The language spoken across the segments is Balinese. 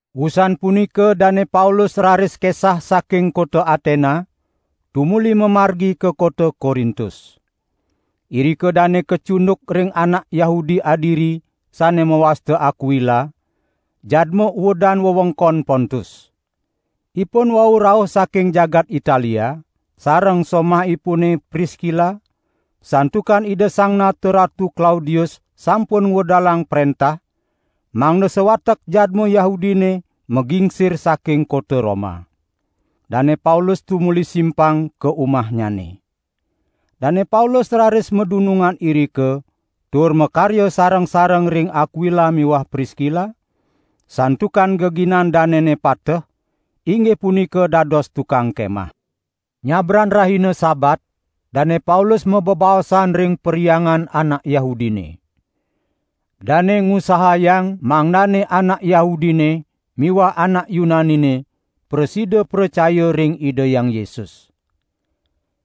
Wusan punika Dane Paulus raris kesah saking kota Atena, tumuli mamargi ka kota Korintus. Irika dane kacunduk ring anak Yahudi adiri sane mawasta Akwila, jadma uedan wewengkon Pontus. Ipun wau rauh saking jagat Italia, sareng somahipune Priskila, santukan Ida Sang Nata Ratu Klaudius sampun ngwedalang prentah, mangda sawatek jadma Yahudine magingsir saking kota Roma. Dane Paulus tumuli simpang ka umahnyane. Dane Paulus raris madunungan irika tur makarya sareng-sareng ring Akwila miwah Priskila, santukan geginan danene pateh, inggih punika dados tukang kemah. Nyabran rahina Sabat Dane Paulus mabebaosan ring perhyangan anak Yahudine. Dane ngusahayang mangdane anak Yahudine miwah anak Yunanine prasida pracaya ring Ida Hyang Yesus.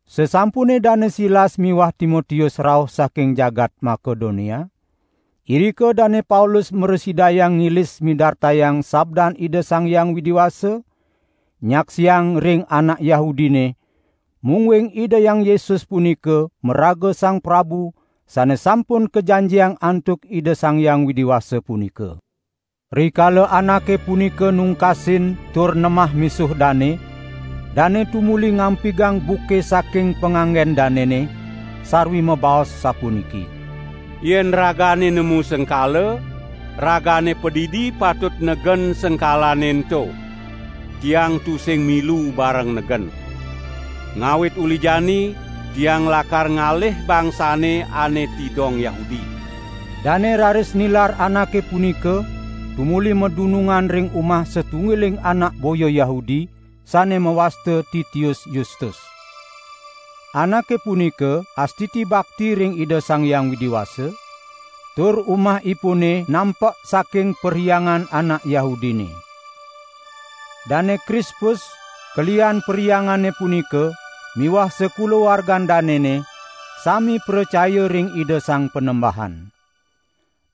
Sasampune Dane Silas miwah Timotius rauh saking jagat Makedonia, irika Dane Paulus mrasidayang ngilis midartayang sabdan Ida Sang Hyang Widi Wasa, nyaksiang ring anak Yahudine, mungguing Ida Hyang Yesus punika maraga Sang Prabu Sane Sampun Kajanjiang antuk Ida Sang Hyang Widi Wasa punika. Rikala anake punika nungkasin tur nemah misuh dane, dane tumuli ngampigang buke saking panganggen danene, sarwi mabaos sapuniki: "Yen ragane nemu sengkala, ragane padidi patut negen sengkalane ento. Tiang tusing milu bareng negen. Ngawit uli jani tiang lakar ngalih bangsane ane tidong Yahudi." Dane raris nilar anake punika tumuli madunungan ring umah satunggiling anak boya Yahudi, sane mawasta Titius Yustus. Anake punika astiti bakti ring Ida Sang Hyang Widi Wasa, tur umahipune nampek saking perhyangan anak Yahudine. Dane Krispus, kelihan perhyangane punika miwah sakulawargan danene sami pracaya ring Ida Sang Panembahan.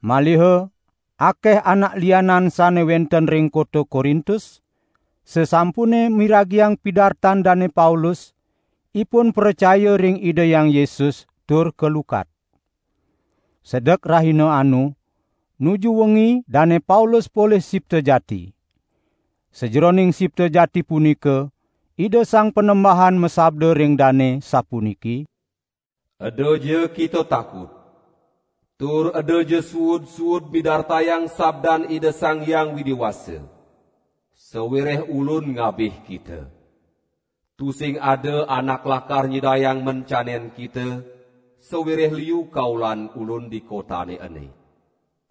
Maliha akeh anak lianan sane wenten ring kota Korintus, sasampune miragiang pidartan Dane Paulus, ipun pracaya ring Ida Hyang Yesus tur kalukat. Sedek rahina anu, nuju wengi Dane Paulus polih sipta jati. Sajeroning sipta jati punika Ida Sang Panembahan masabda ring dane sapuniki: "Edaja kita takut! Tur edaja suud-suud midartayang sabdan Ida Sang Hyang Widi Wasa. Sawireh Ulun ngabih kita. Tusing ada anak lakar nyidayang mencanen kita, sawireh liu kaulan Ulun di kotane ene."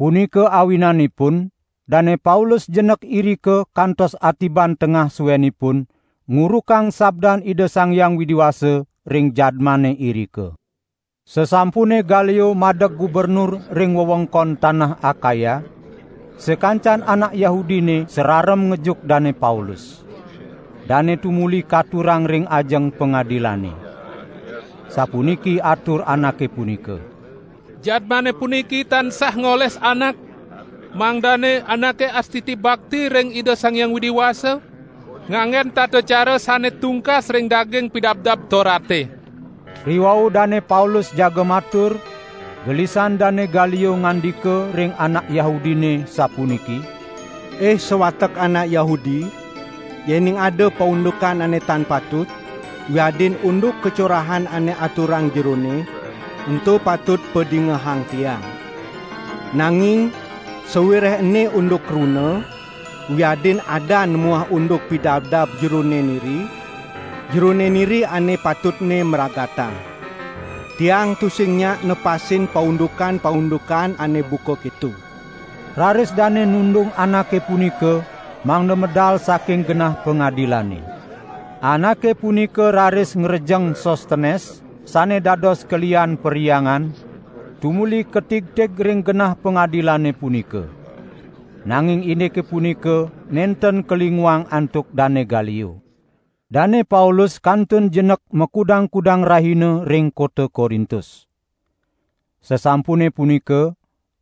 Punika awinanipun Dane Paulus jenek irika kantos atiban tengah suenipun ngurukang sabdan Ida Sang Hyang Widi Wasa ring jadmane irika. Sasampune Galio madeg gubernur ring wewengkon tanah Akaya, sakancan anak Yahudine sararem ngejuk Dane Paulus. Dane tumuli katurang ring ajeng pangadilane. Sapuniki atur anake punika: "Jadmane puniki tansah ngoles anak, mangdane anake astiti bakti ring Ida Sang Hyang Widi Wasa, nganggen tata cara sane tungkas ring daging Pidabdab Torate!" Riwau Dane Paulus jaga matur, gelisan Dane Galio ngandika ring anak Yahudine sapuniki: "Ih sawatek anak Yahudi, yening ada paundukan ane tan patut wiadin unduk kacorahan ane aturang jerone, ento patut padingehang tiang. Nanging sawireh ene unduk kruna wiadin adan muah unduk pidabdab jerone niri, jerone niri ane patutne mragatang. Tiang tusing nyak nepasin paundukan-paundukan ane buka keto." Raris dane nundung anake punika mangda medal saking genah pangadilane. Anake punika raris ngrejeng Sostenes sane dados kelihan perhyangan, tumuli katigtig ring genah pangadilane punika. Nanging indike punika nenten kalinguang antuk Dane Galio. Dane Paulus kantun jenek makudang-kudang rahina ring kota Korintus. Sasampune punika,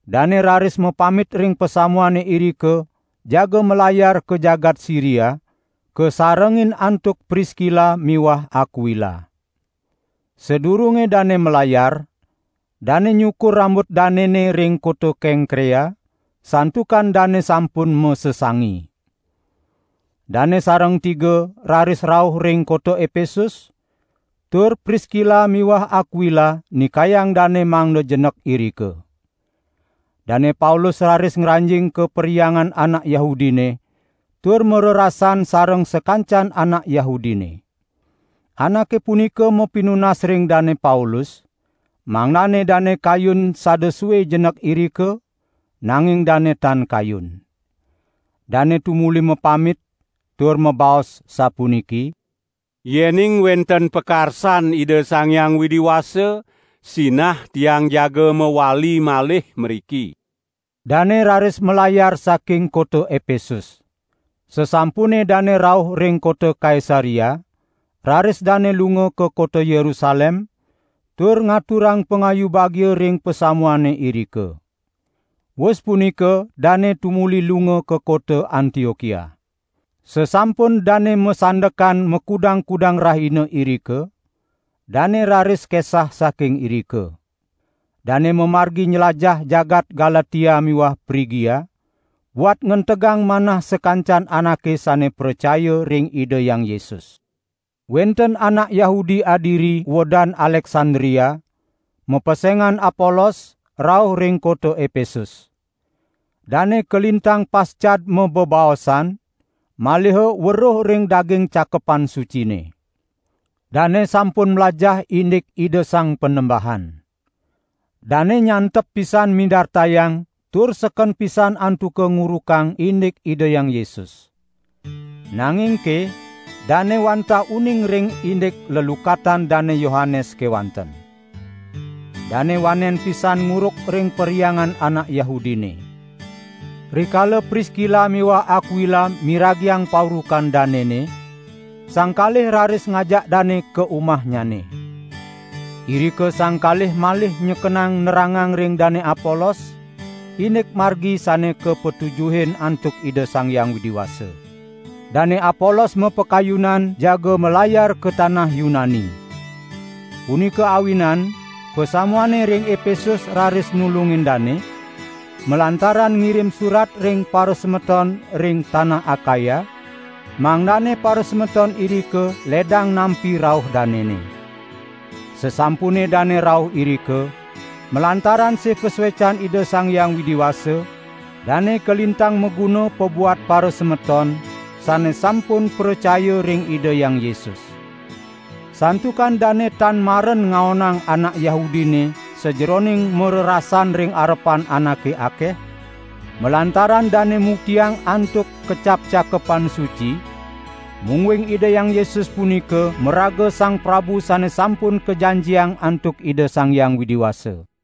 dane raris mapamit ring pasamuane irika jaga malayar ka jagat Siria, kasarengin antuk Priskila miwah Akwila. Sadurunge dane malayar, dane nyukur rambut danene ring kota Kengkrea, santukan dane sampun masesangi. Dane sareng tiga raris rauh ring kota Epesus tur Priskila miwah Akwila nikayang dane mangda jenek irika. Dane Paulus raris ngranjing ka perhyangan anak Yahudine tur marerasan sareng sakancan anak Yahudine. Anake punika mapinunas ring Dane Paulus, mangdane dane kayun sada sue jenek irika, nanging dane tan kayun. Dane tumuli mapamit, tur mabaos sapuniki: "Yening wenten pakarsan Ida Sang Hyang Widi Wasa, sinah tiang jaga mawali malih mriki." Dane raris malayar saking kota Epesus. Sasampune dane rauh ring kota Kaisarea, raris dane lunga ka kota Yerusalem, tur ngaturang pangayu bagia ring pasamuane irika. Wus punika dane tumuli lunga ka kota Antiokia. Sasampun dane masandekan makudang-kudang rahina irika, dane raris kesah saking irika. Dane mamargi nylajah jagat Galatia miwah Prigia, buat ngentegang manah sakancan anake sane pracaya ring Ida Hyang Yesus. Wenten anak Yahudi adiri uedan Aleksandria, mapesengan Apolos rauh ring kota Epesus. Dane kalintang pascad mabebaosan, maliha weruh ring daging Cakepan Sucine. Dane sampun mlajah indik Ida Sang Panembahan. Dane nyantep pisan midartayang tur seken pisan antuka ngurukang indik Ida Hyang Yesus. Nangingke dane wantah uning ring indik lelukatan Dane Yohanes kewanten. Dane wanen pisan nguruk ring perhyangan anak Yahudine. Rikala Priskila miwah Akwila miragiang paurukan danene, sang kalih raris ngajak dane ka umahnyane. Irika sang kalih malih nyekenang nerangang ring Dane Apolos, indik Margi sane kapatujuhin antuk Ida Sang Hyang Widi Wasa. Dane Apolos mapakayunan jaga malayar ka tanah Yunani. Punika awinan pasamuane ring Epesus raris nulungin dane, malantaran ngirim surat ring parasemeton ring tanah Akaya, mangdane parasemeton irika ledang nampi rauh danene. Sasampune dane rauh irika, malantaran sih pasuecan Ida Sang Hyang Widi Wasa, dane kalintang maguna pabuat parasemeton sane sampun pracaya ring Ida Hyang Yesus. Santukan dane tan maren ngaonang anak Yahudine sajeroning marerasan ring arepan anake akeh, malantaran dane muktiang antuk kecap Cakepan Suci, mungguing Ida Hyang Yesus punika maraga Sang Prabu Sane Sampun Kajanjiang antuk Ida Sang Hyang Widi Wasa.